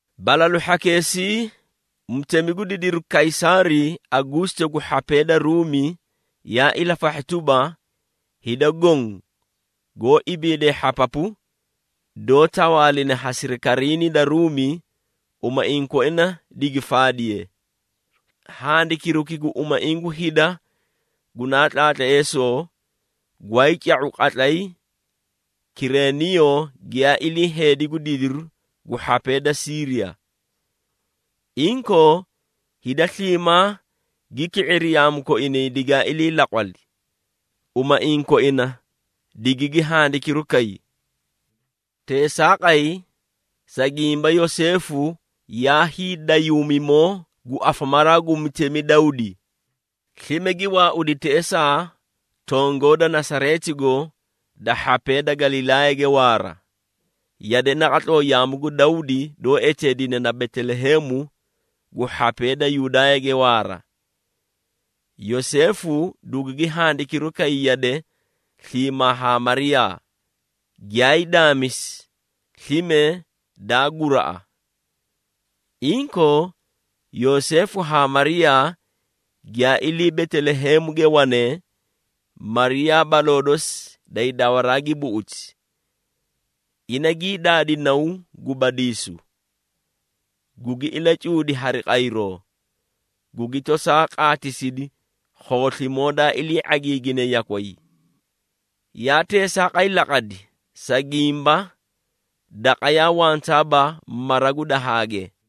Balalu hhakeesii, mutemi gu didiru Kaysaari Aguusito gu hhapee da Ruumi yaa ilafahhi tuba, hida goõ goó ibiidee hhapapu, doó tawaaline ha sirikariinii da Ruumi, umaiĩ koina digi faadiye. (Handikiruki gu umaiĩ gu hida gunaa tlaatleesoo, gwaay ca⁄u qatlay Kireniiyo giyaa ilii heedi gu didiru gu hhapee da Siiriya). Inkoo, hida sliimaa gi ki⁄iri yaamu koinay digaa ilii laqwali, umaiĩ koina digigi handikiru kay. Teesaaqay, sa gimba Yoseefu yaa hiidayuumimoo gu afamaraa gu mutemi Dawdi, slime gi waaudi teꞌesaa tongoo da Nasareetigo da hhapee da Galilaayage waara, yade naqatloo yaamu gu Dawdi doó eteedine na Beteleheemu gu hhapee da Yudaayage waara. Yoseefu dugugi handikiru kay yade sliimaa haa Mariyaa, giyaay daamisi, slime daa guraꞌa. Inkoo Yoseefu haa Mariyaa giyaa ilii Beteleheemuge wanee, Mariyaa baloo dosi day dawaraa gi buꞌuti. Ina gii daadi naw gu badiisu, gugi ilacuudi hari qayroo, gugi tosaa qaatisidi khooslimoo daa ilii ⁄agiigine yakway. Yaa teesaaqay laqadi, sa gimba daqa yaa wantaaba mara gu dahaage.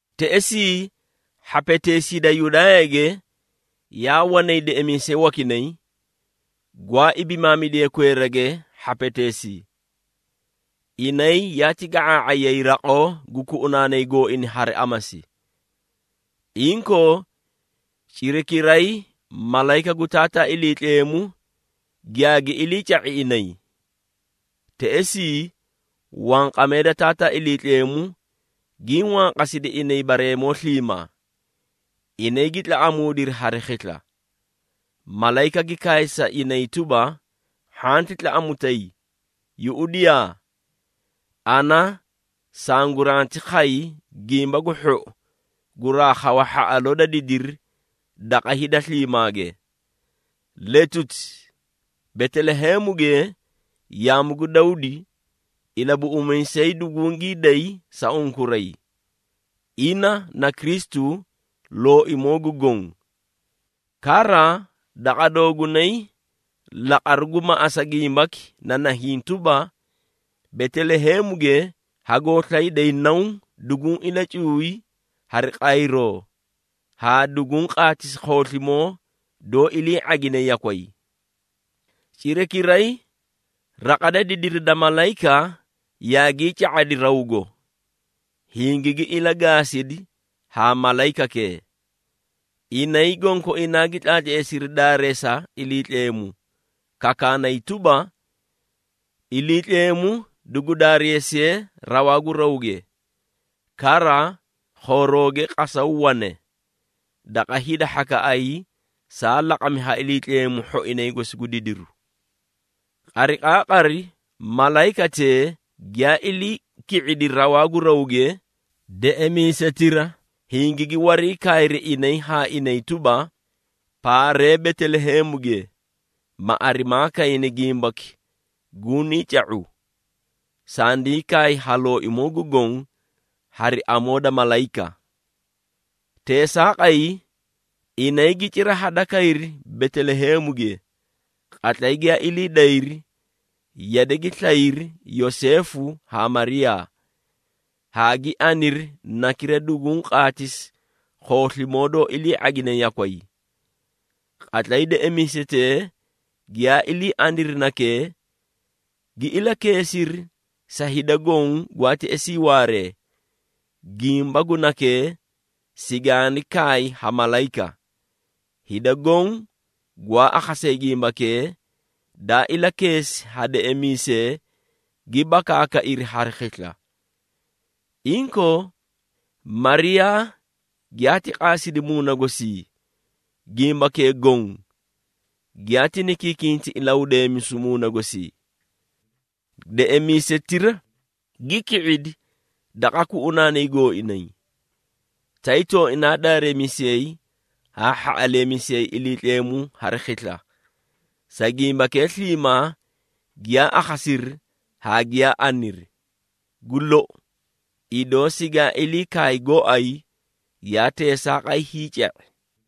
Teꞌesii hhapeteesii da Yudaayage, yaa wanay deꞌemiisee wakinay, gwaa ibimaamidee kweerage hhapeteesii. Inay yaati ga⁄aa⁄ayay raqoo gu kuꞌunaanay gooina hari amasi. Inkoo, cirakiray malayika gu Taataa Iliitleemu giyaagi iliica⁄i inay. Teꞌesii, wanqamee da Taataa Iliitleemu gii wanqasidi inay bareemoo sliimaa. Inay gi tlaꞌamuudiri hari khisla. Malayika gi kaay sa inay tuba, “Hhanti tlaꞌamutay! Yuꞌudiyaa, ana sanguranti khay gimba gu hhou guraa khawa hhaꞌaloo da didiri daqa hida sliimaage. Letuti, Beteleheemuge, yaamu gu Dawdi, Ilabuꞌumiisay dugungii day sa unkuray, ina na Kristu, Looimoo gu Goõ. Kara daqa doogunay laqaru gu maꞌasa gimbaki na nahiĩ tuba, Beteleheemuge hagoo slayday naw duguũ ilacuuy hari qayroo haa duguũ qaatisi khooslimoo doó ilii ⁄agine yakway.” Cirakiray, raqa da didiri da malayika yaagii ca⁄adi rawgo, hingigi ilagaasidi haa malayikakee. Inay gonkoinaa gi tlaatleesiri daareesa Iliitleemu, kakaanay tuba, “Iliitleemu dugu daareesiye rawaa gu rawge! Kara khoorooge qasaw wane, daqa hida hhakaꞌay saa laqami ha Iliitleemu hhoinay gosi gu didiru.” Qariqaaqari malayikatee giyaa ilii ki⁄idi rawaa gu rawge, deꞌemiisetira hingigi wariikaayri inay haa inay tuba, “Paaree Beteleheemuge, ma arimaa kayni gimbaki gunii ca⁄u, sandii kaay ha Looimoo gu Goõ hari amoo da malayika.” Teesaaqay, inay gi cira hadakayri Beteleheemuge. Qatlay giyaa ilii dayri, yade gi slayri Yoseefu haa Mariyaa, haa gi aniri nakira duguũ qaatisi khooslimoo doó ilii ⁄agine yakway. Qatlay deꞌemiisetee giyaa ilii aniri nakee, gi ilakeesiri sa hida goõ gwaa teꞌesii waaree, gimba gu nakee sigaani kaay ha malayika. Hida goõ gwaa akhasee gimbakee, daa ilakeesi ha deꞌemiisee gi bakaakairi hari khisla. Inkoo, Mariyaa giyaati qaasidi muuna gosii, gimbakee goõ giyaati nikinkinta ilahudeemisu muuna gosii. Deꞌemiisetira gi ki⁄idi daqa kuꞌunaanay gooinay, tay tooinaa daareemisiyay haa hhaꞌaleemisiyay Iliitleemu hari khisla, sa gimbakee sliimaa giyaa akhasiri haa giyaa aniri. Gu lou, idoo sigaa ilii kaay gooay, yaa teesaaqay hiica⁄i.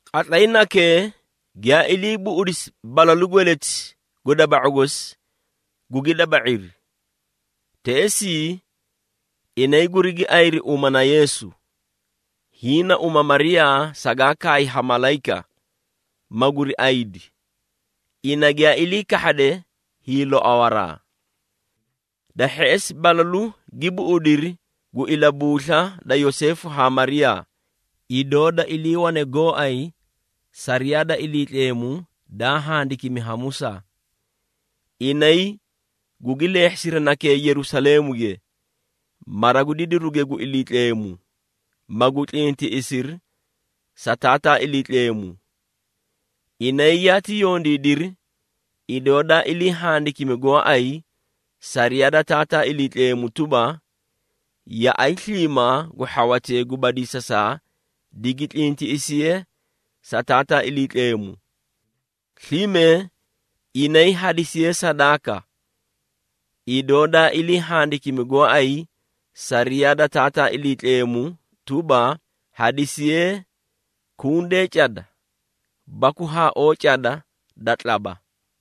Qatlay nakee, giyaa ilii buꞌudisi balalu gweleti gu daba⁄u gosi, gugi daba⁄iri. Teꞌesii inay gurigi ayiri uma na Yeesu. Hiĩ na uma Mariyaa sagaa kaay ha malayika, maguri ayidi, ina giyaa ilii kahhade hiiloawaraa. Da hheꞌesi, balalu gi buꞌudiri gu ilabuusla da Yoseefu haa Mariyaa, idoo da iliiwane gooay sariyaa da Iliitleemu daa handikimi ha Musaa. Inay gugi leehhisiri nakee Yerusaleemuge, mara gu didiruge gu Iliitleemu, magu tlintiꞌisiri sa Taataa Iliitleemu. Inay yaati yondiidiri, idoo daa ilii handikimi gooay sariyaa da Taataa Iliitleemu tuba, “Yaꞌay sliimaa gu hhawatee gu badiisasaa digi tlintiꞌisiye sa Taataa Iliitleemu.” Slime inay hadisiyee sadaaka, idoo daa ilii handikimi gooay sariyaa da Taataa Iliitleemu tuba, hadisiyee “kunde cada baku haaoo cada da tlaba.”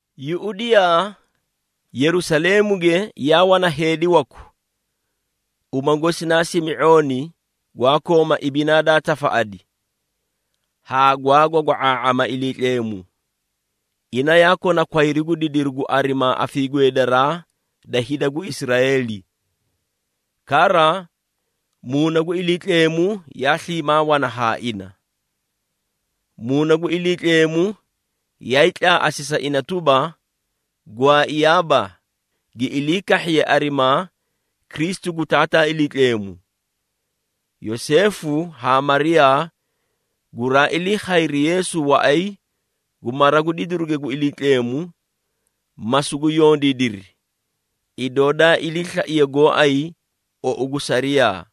Yuꞌudiyaa, Yerusaleemuge yaa wana heedi waku, uma gosi naa Simi⁄ooni gwaa kooma ibinaa daa tafaꞌadi haa gwaa gwagwa⁄aa⁄ama Iliitleemu. Ina yaa kona kwayru gu didiru gu arimaa afiigweedaraa da hida gu Israeeli. Kara, Muuna gu Iliitleemu yaa sliimaa wana haa ina. Muuna gu Iliitleemu yaay tlaaꞌasi sa ina tuba, gwaaiyaaba, gi ilii kahhiye arimaa Kristu gu Taataa Iliitleemu. Yoseefu haa Mariyaa guraa ilii khayri Yeesu waꞌay gu mara gu didiruge gu Iliitleemu, ma sugu yondiidiri, idoo daa iliislaiye gooay uo gu sariyaa.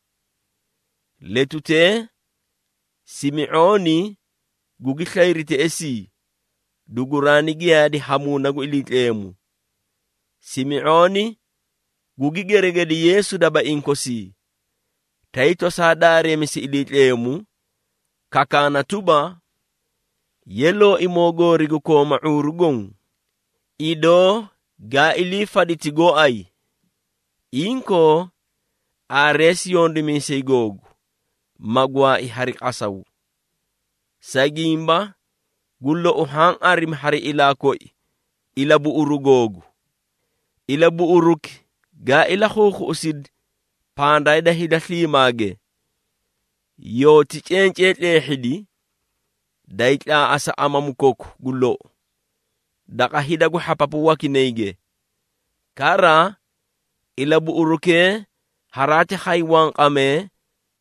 Letutee Simi⁄ooni gugi slayri teꞌesii, duguraani giyaadi ha Muuna gu Iliitleemu. Simi⁄ooni gugi geregedi Yeesu dabaiĩ kosii, tay tosaa daareemisi Iliitleemu, kakaana tuba, “Ye, Looimoo goori gu kooma ⁄uuru goõ, idoo gaa ilii faditi gooay, inkoo, aareesi yondimiisay googu, ma gwaai hari qasaw, sa gimba, gu lou haã arimi hari ilaa koi, ilabuꞌuru googu. Ilabuꞌuriki gaa ilakhuukhuꞌusidi, pandaa da hida sliimaage, yoóti cencee tleehhidi, daay tlaaꞌasa amamu koku gu lou, daqa hida gu hhapapu wakinayge. Kara, ilabuꞌurukee haraati khay wanqamee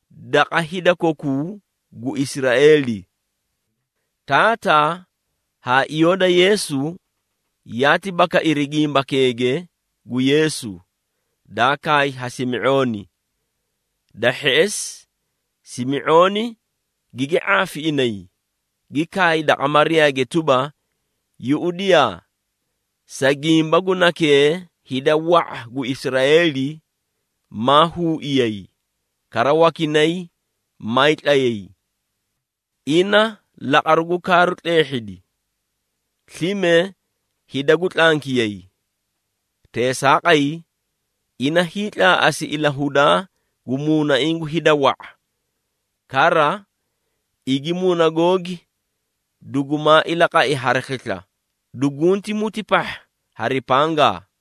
daqa hida kokuu gu Israeeli.” Taataa haa iyoo da Yeesu yaati bakairi gimbakeege gu Yeesu, daa kaay ha Simi⁄ooni. Da hheꞌesi Simi⁄ooni gigi ⁄aafi inay, gi kaay daqa Mariyaage tuba, “Yuꞌudiyaa! Sa gimba gu Nakee hida wa⁄a gu Israeeli, maa huuiyay, kara wakinay maay tlayay. Ina laqaru gu kaaru tleehhidi, slime hida gu tlankiyay. Teesaaqay, ina hiitlaaꞌasi ilahudaa gu muunaiĩ gu hida wa⁄a. Kara igi muuna googi dugumaa ilaqai hari khisla, dugunti muti pahha hari pangaa!”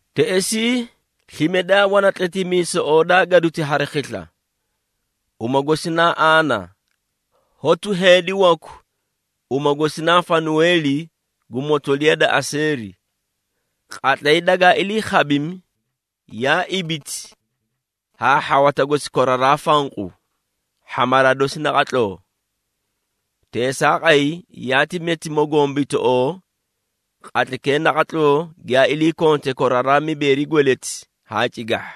Teꞌesii, slime daa wana tletimiisoꞌoo daa gaduti hari khisla, uma gosi naa Aana, hotu heedi waku uma gosi naa Fanuweeli gu motoliya da Aseeri. Qatlay dagaa ilii khabimi, yaa ibiti haa hhawata gosi koraraa fanqu, hhamaraa dosi naqatloo. Teesaaqay yaati meti mogombitoꞌoo, qatlaykee naqatloo giyaa ilii konte koraraa mibeeri gweleti haa cigahha.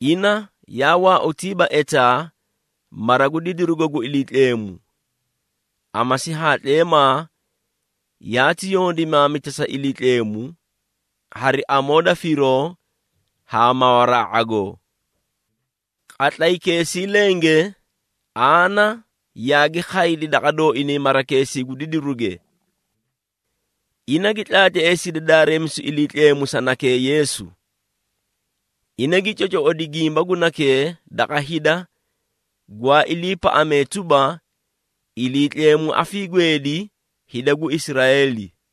Ina yaa waautiiba etaa mara gu didirugo gu Iliitleemu. Amasi haa tleemaa yaati yondimaamita sa Iliitleemu, hari amoo da firoo haa mawaraa ⁄agoo. Qatlaykeesii lenge, Aana yaagi khaydi daqa dooinay marakeesii gu didiruge. Ina gi tlaatleesidi daareemisu Iliitleemu sa nakee, Yeesu. Ina gi cocoꞌodi gimba gu nakee daqa hida, gwaa iliipaꞌaaꞌamee tuba, Iliitleemu afiigweedi hida gu Israeeli.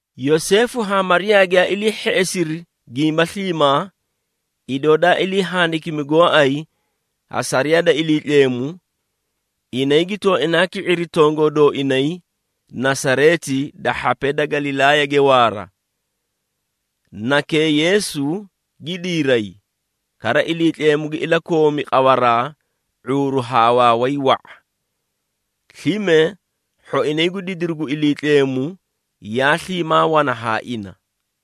Yoseefu haa Mariyaa giyaa ilii hheꞌesiri gimba sliimaa, idoo daa ilii handikimi gooay ha sariyaa da Iliitleemu, inay gi tooinaa ki⁄iri tongoo dooinay Nasareeti da hhapee da Galilaayage waara. Nakee, Yeesu gi diiray, kara Iliitleemu gi ilakoomi qawaraa ⁄uuru haa waaway wa⁄a. Slime hhoinay gu didiru gu Iliitleemu yaa sliimaa wana haa ina.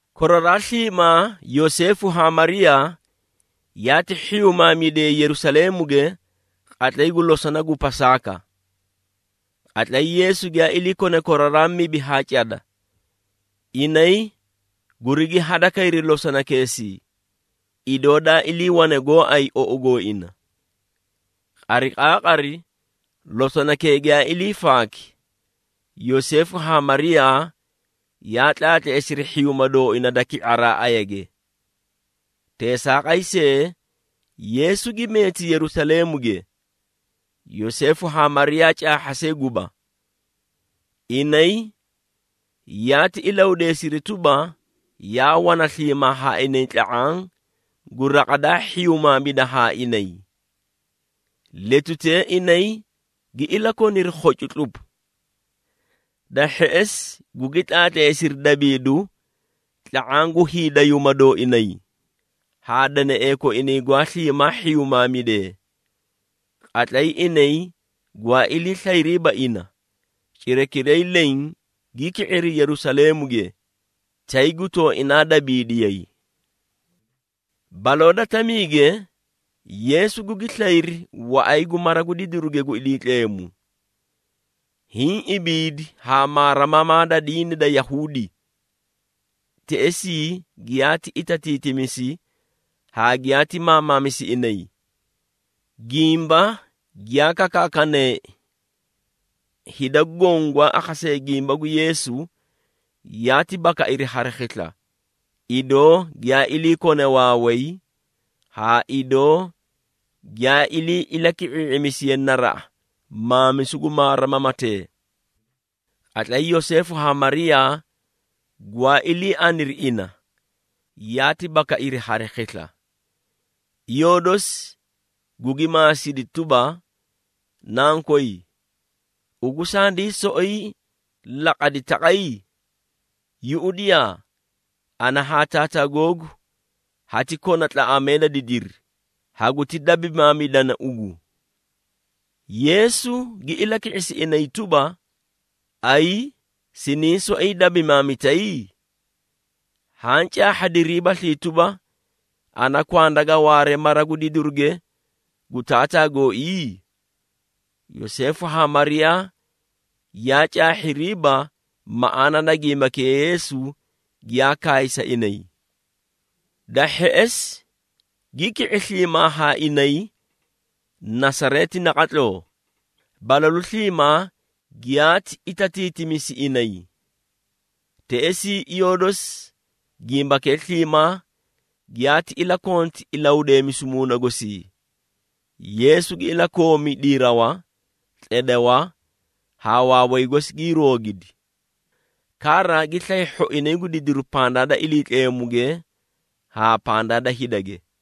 Koraraa sliimaa Yoseefu haa Mariyaa yaati hhiyumaamidiyay Yerusaleemuge qatlay gu losona gu Pasaaka. Qatlay Yeesu giyaa ilii kone koraraa mibi haa cada, inay gurigi hadakayri losonakeesii, idoo daa iliiwane gooay ou gooina. Qariqaaqari losonakee giyaa ilii faaki, Yoseefu haa Mariyaa yaa tlaatleesiri hhiyuuma dooina da ki⁄araa ayage. Teesaaqay see, Yeesu gi meeti Yerusaleemuge, Yoseefu haa Mariyaa caahha see guba. Inay yaati ilahudeesiri tuba, yaa wana sliimaa haa inay tla⁄aã gu raqa daa hhiyumaamida haa inay. Letutee inay gi ilakoniri khocu tlupu. Da hheꞌesi gugi tlaatleesiri daabiidu tla⁄aã gu hiidayuuma dooinay haa deneꞌee koinay gwaa sliimaa hhiyumaamidee. Qatlay inay gwaa ilii slayriiba ina, cirakiray leẽ gi ki⁄iri Yerusaleemuge, tay gu tooinaa daabiidiyay. Baloo da tamiige, Yeesu gugi slayri waꞌay gu mara gu didiruge gu Iliitleemu, hiĩ ibiidi haa maarimamaa da diini da Yahuudi. Teꞌesii giyaati itatiitimisi haa giyaati maamamisi inay, gimba giyaa kakaakaneei. Hida goõ gwaa akhasee gimba gu Yeesu, yaati bakairi hari khisla, idoo giyaa ilii kone waaway, haa idoo giyaa ilii ilaki⁄ii⁄imisiye naraꞌa maamisu gu maarimamatee. Qatlay Yoseefu haa Mariyaa, gwaa ilii aniri ina, yaati bakairi hari khisla. Iyoo dosi gugi maasidi tuba, “Nankoy, ugu sandii soꞌoyi laqadi taqay? Yuꞌudiyaa! Ana haa Taataa googu hati kona tlaꞌamee da didiri, haguti dabimaamidana ugu!” Yeesu gi ilaki⁄isi inay tuba, “Ayi! Siniĩ soꞌoyi dabimaamitay? Haã caahhadiriibaslii tuba, ana kwanda ga waare mara gu didiruge gu Taataa gooii?” Yoseefu haa Mariyaa yaa caahhiriiba maꞌaana da gimbakee Yeesu giyaa kaay sa inay. Da hheꞌesi gi ki⁄i sliimaa haa inay Nasareeti naqatloo, balalu sliimaa giyaati itatiitimisi inay. Teꞌesii iyoo dosi, gimbakee sliimaa giyaati ilakonti ilahudeemisu muuna gosii. Yeesu gi ilakoomi diirawa, tledewa haa waaway gosi gii roogidi. Kara gi slay hhoinay gu didiru pandaa da Iliitleemuge haa pandaa da hidage.